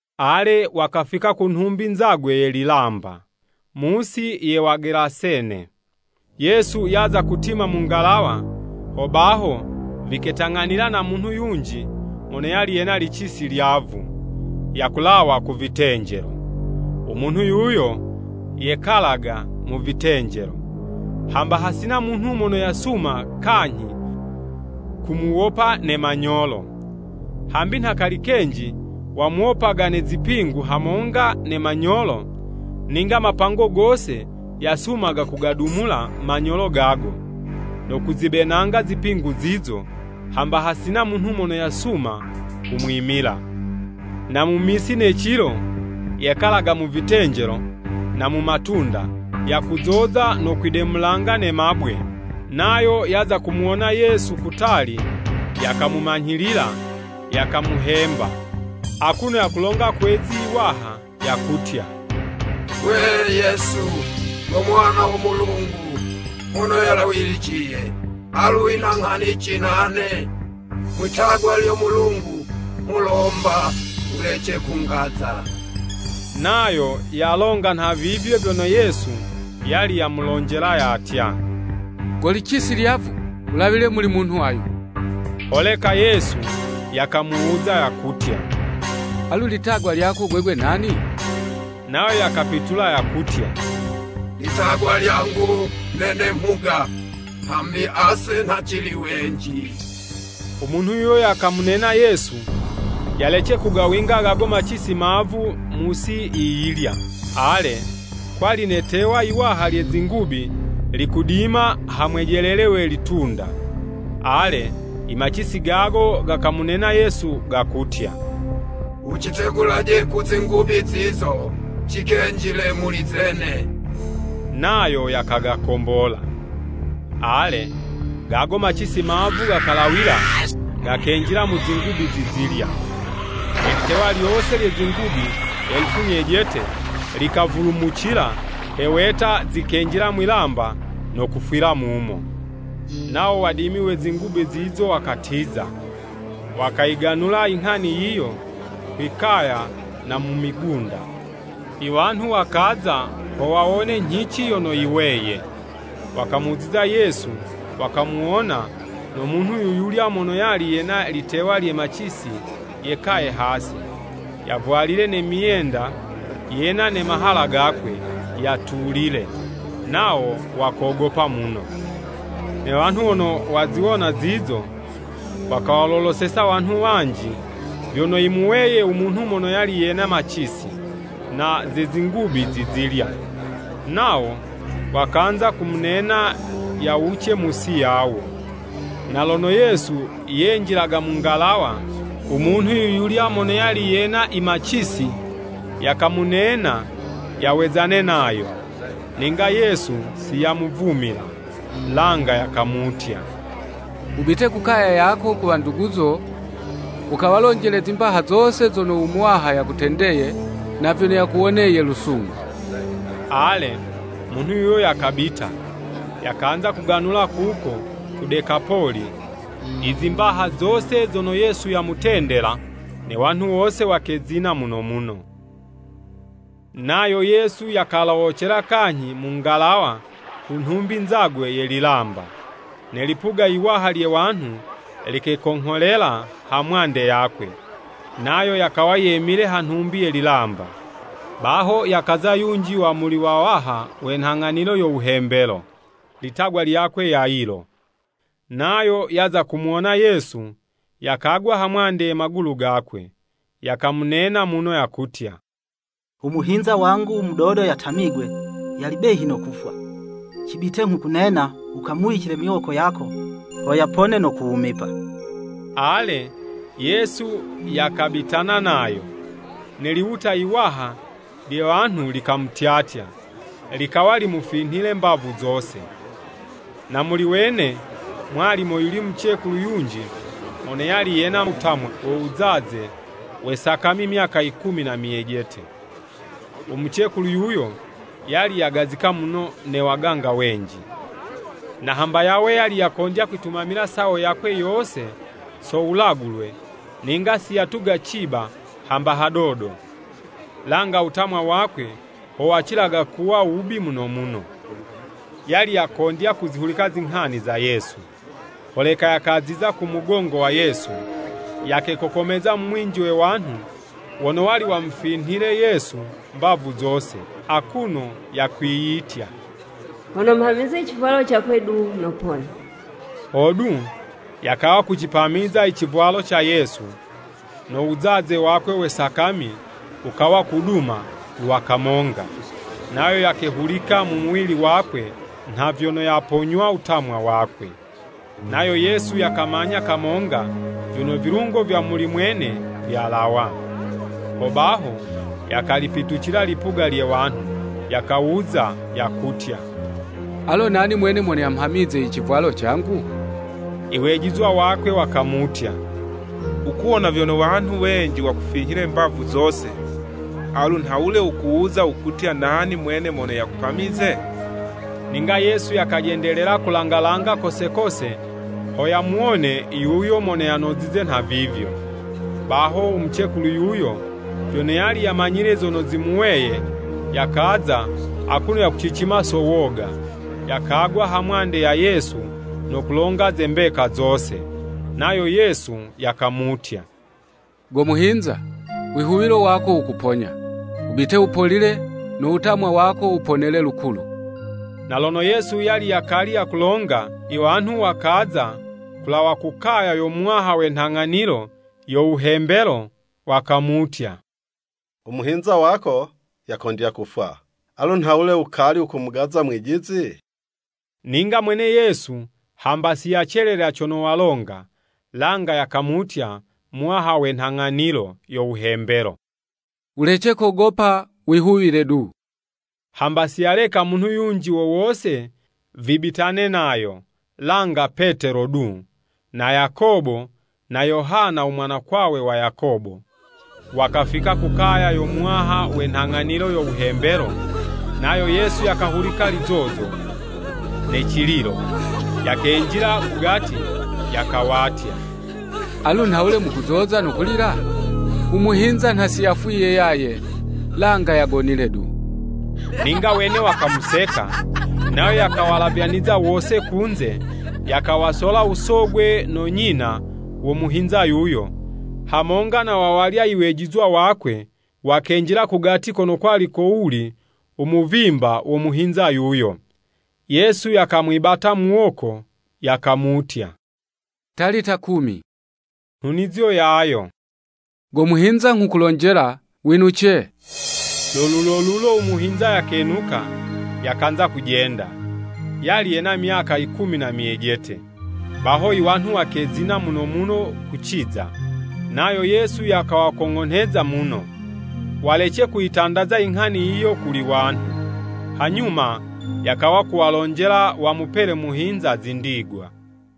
Ale, wakafika ku nhumbi nzagwe ye lilamba, mu'si ye Wagelasene. Yesu yaza kutima mu ngalawa, hobaho viketang'anila na munhu yunji mono yali yena licisi lyavu, yakulawa ku vitenjelo. U munhu yuyo yekalaga mu vitenjelo, hamba hasina munhu mono yasuma kanyhi kumuwopa ne manyolo. Hambi nha kali kenji wamuwopaga ne zipingu hamonga ne manyolo, ninga mapango gose yasumaga kugadumula manyolo gago, no kuzibenanga zipingu zizo, hamba hasina munhu mono yasuma kumwimila. Na mu misi ne cilo, yekalaga mu vitenjelo, na mu matunda, yakuzoza no kwidemulanga ne mabwe. Nayo yaza kumuwonela Yesu kutali, yakamumanyhilila, yakamuhemba, akuno yakulonga kwe'zi 'waha yakutya, “Gwe, Yesu, go Mwana wo Mulungu Mono Yalawiliciye, alu wina nghanici nane? Mwi'tagwa lyo Mulungu, nghulomba wulece kungaza!” (Nayo yalonga nhavivyo vyono Yesu yali yamulonjela yatya, “Go licisi lyavu, wulawile muli munhu ayu.”) Holeka Yesu yakamuwuza, yakutya, “Alu litagwa lyako gwegwe nani?” Nayo yakapitula, yakutya, “Litagwa lyangu nene ‘Mhuga’ hambi ase nha cili wenji.” U munhu yuyo yakamunena Yesu, yalece kugawinga gago macisi mavu mu'si yiyilya. Ale kwali ne'tewa yiwaha lye zingubi likudima ha mwejelele we litunda. Ale, imacisi gago gakamunena Yesu, gakutya, “Wucitegulaje ku zingubi zizo, cikenjile muli zene.” Nayo yakagakombola. Ale, gago macisi mavu gakalawila, gakenjila mu zingubi zizilya. Ne litewa lyose lye zingubi elufu nyejete, likavulumucila he weta zikenjila mwi'lamba, no kufwila mumo. Nawo wadimi we zingubi zizo wakatiza, wakayiganula i nghani yiyo kwi'kaya na mu migunda. Iwanhu wakaza ho wawone nyhici yono yiweye. Wakamuziza Yesu, wakamuwona no munhu yuyulya mono yali yena litewa lye macisi yekaye hasi, yavwalile ne myenda, yena ne mahala gakwe, yatulile, nawo wakogopa muno. Ne wanhu wono waziwona zizo, wakawaloloseza wanhu wanji vyono yimuweye u munhu mono yali yena macisi, na ze zingubi zizilya. Nawo, wakanza kumunena yawuce mu'si yawo. Na lono Yesu yenjilaga mu ngalawa, u munhu yuyulya mono yali yena imacisi, yakamunena yawezane nayo. Ninga Yesu siyamuvumila. Langa yakamutya, “Wubite ku kaya yako, ku wanduguzo, wukawalonjele zimbaha zose zono u Muwaha yakutendeye na vyono yakuwoneye lusungu.” Ale, munhu yuyo yakabita, yakanza kuganula kuko ku Dekapoli i zimbaha zose zono Yesu yamutendela, ne wanhu wose wakezina muno muno. Nayo Yesu yakalowocela kanyhi mu ngalawa ku nhumbi nzagwe ye lilamba. Ne lipuga yiwaha lye wanhu likekongholela ha mwande yakwe, nayo yakawa yemile ha nhumbi ye lilamba. Baho yakaza yunji wa muli wawaha we nhang'anilo yo wuhembelo, litagwa Iyakwe Yayilo. Nayo yaza kumuwona Yesu, yakagwa hamwande ye magulu gakwe, yakamunena muno yakutya, “Umuhinza wangu mudodo yatamigwe, yali behi no kufwa. Cibite nghukunena, wukamuwicile miwoko yako, ho yapone no kuwumipa!” Ale, Yesu yakabitana nayo. Ne liwuta yiwaha lye wanhu likamutyatya, likawa limufinhile mbavu zose. Na muli wene mwali moyuli mucekulu yunji mono yali yena wutamwa wo wuzaze we sakami myaka yikumi na myejete. Umucekulu yuyo yali yagazika muno ne waganga wenji. Na hamba yawe yali yakondya kwitumamila sawo yakwe yose so wulagulwe, ninga siyatuga ciba hamba hadodo, langa wutamwa wakwe ho wukacila kuwa wubi muno muno. Yali yakondya kuzihulika zinghani za Yesu, holeka yakaziza ku mugongo wa Yesu, yakekokomeza mu mwinji we wanhu wono wali wumufinhile Yesu mbavu zose, akuno yakwiyitya, “Hono mhamize civwalo cakwe du, nopona.” Hodu, yakawa kucipamiza i civwalo ca Yesu, no wuzaze wakwe we sakami, wukawa kuduma lwa kamonga, nayo yakehulika mu muwili wakwe nha vyono yaponywa wutamwa wakwe. Nayo Yesu yakamanya kamonga vyono vilungo vya muli mwene vyalawa. Hobaho, yakalipitucila lipuga lye wanhu, yakawuza, yakutya, “Alo nani mwene mono yamhamize i civwalo cangu?” Iwejizwa wakwe wakamutya, “Wukuwona vyono wanhu wenji wakufinhile mbavu zose, alu nhawule wukuwuza wukutya nani mwene mono yakupamize?” Ninga Yesu yakajendelela kulanga langa kose kose ho yamuwone yuyo mono yanozize nhavivyo. Baho umucekulu yuyo, vyono yali yamanyile zono zimuweye, yakaza akuno yakucicima so woga, yakagwa hamwande ya Yesu no kulonga ze mbeka zose. Nayo Yesu yakamutya, “Go muhinza, wihuwilo wako wukuponya. Wubite wupolile, no wutamwa wako wuponele lukulu.” Na lono Yesu yali yakali yakulonga, iwanhu wakaza kulawa ku kaya yo muwaha we nhang'anilo yo wuhembelo, wakamutya, “Umuhinza wako yakondya kufwa. Alu nhawule wukali wukumugaza Mwijizi?” Ninga mwene Yesu hamba siyacelelela cono walonga, langa yakamutya muwaha we nhang'anilo yo wuhembelo, “Wulece kogopa, wihuwile du.” Hamba siyaleka munhu yunji wo wose vibitane nayo, langa Petelo du, na Yakobo na Yohana u mwanakwawe wa Yakobo. Wakafika ku kaya yo muwaha we nhang'anilo yo wuhembelo, nayo Yesu yakahulika lizozo, ne cililo. Yakenjila ku gati, yakawatya, “Alu nhawule mukuzoza no kulila? U muhinza nha siyafwiye yaye, langa yagonile du.” Ninga wene wakamuseka. Nayo, yakawalavyaniza wose kunze, yakawasola usogwe no nyina wo muhinza yuyo, hamonga na wawalya iwejizwa wakwe, wakenjila kugati kono kwali kowuli u muvimba wo muhinza yuyo. Yesu yakamwibata muwoko, yakamutya, “Talita kumi.” Nhunizo yayo, “Go muhinza nghukulonjela, winuce!” Lo lulolulo umuhinza yakenuka, yakanza kujenda. (Yali yena myaka ikumi na myejete.) Baho, iwanhu wakezina muno muno kuciza. Nayo Yesu yakawakong'onheza muno, walece kuyitandaza inghani yiyo kuli wanhu. Hanyuma yakawa kuwalonjela wamupele muhinza zindigwa.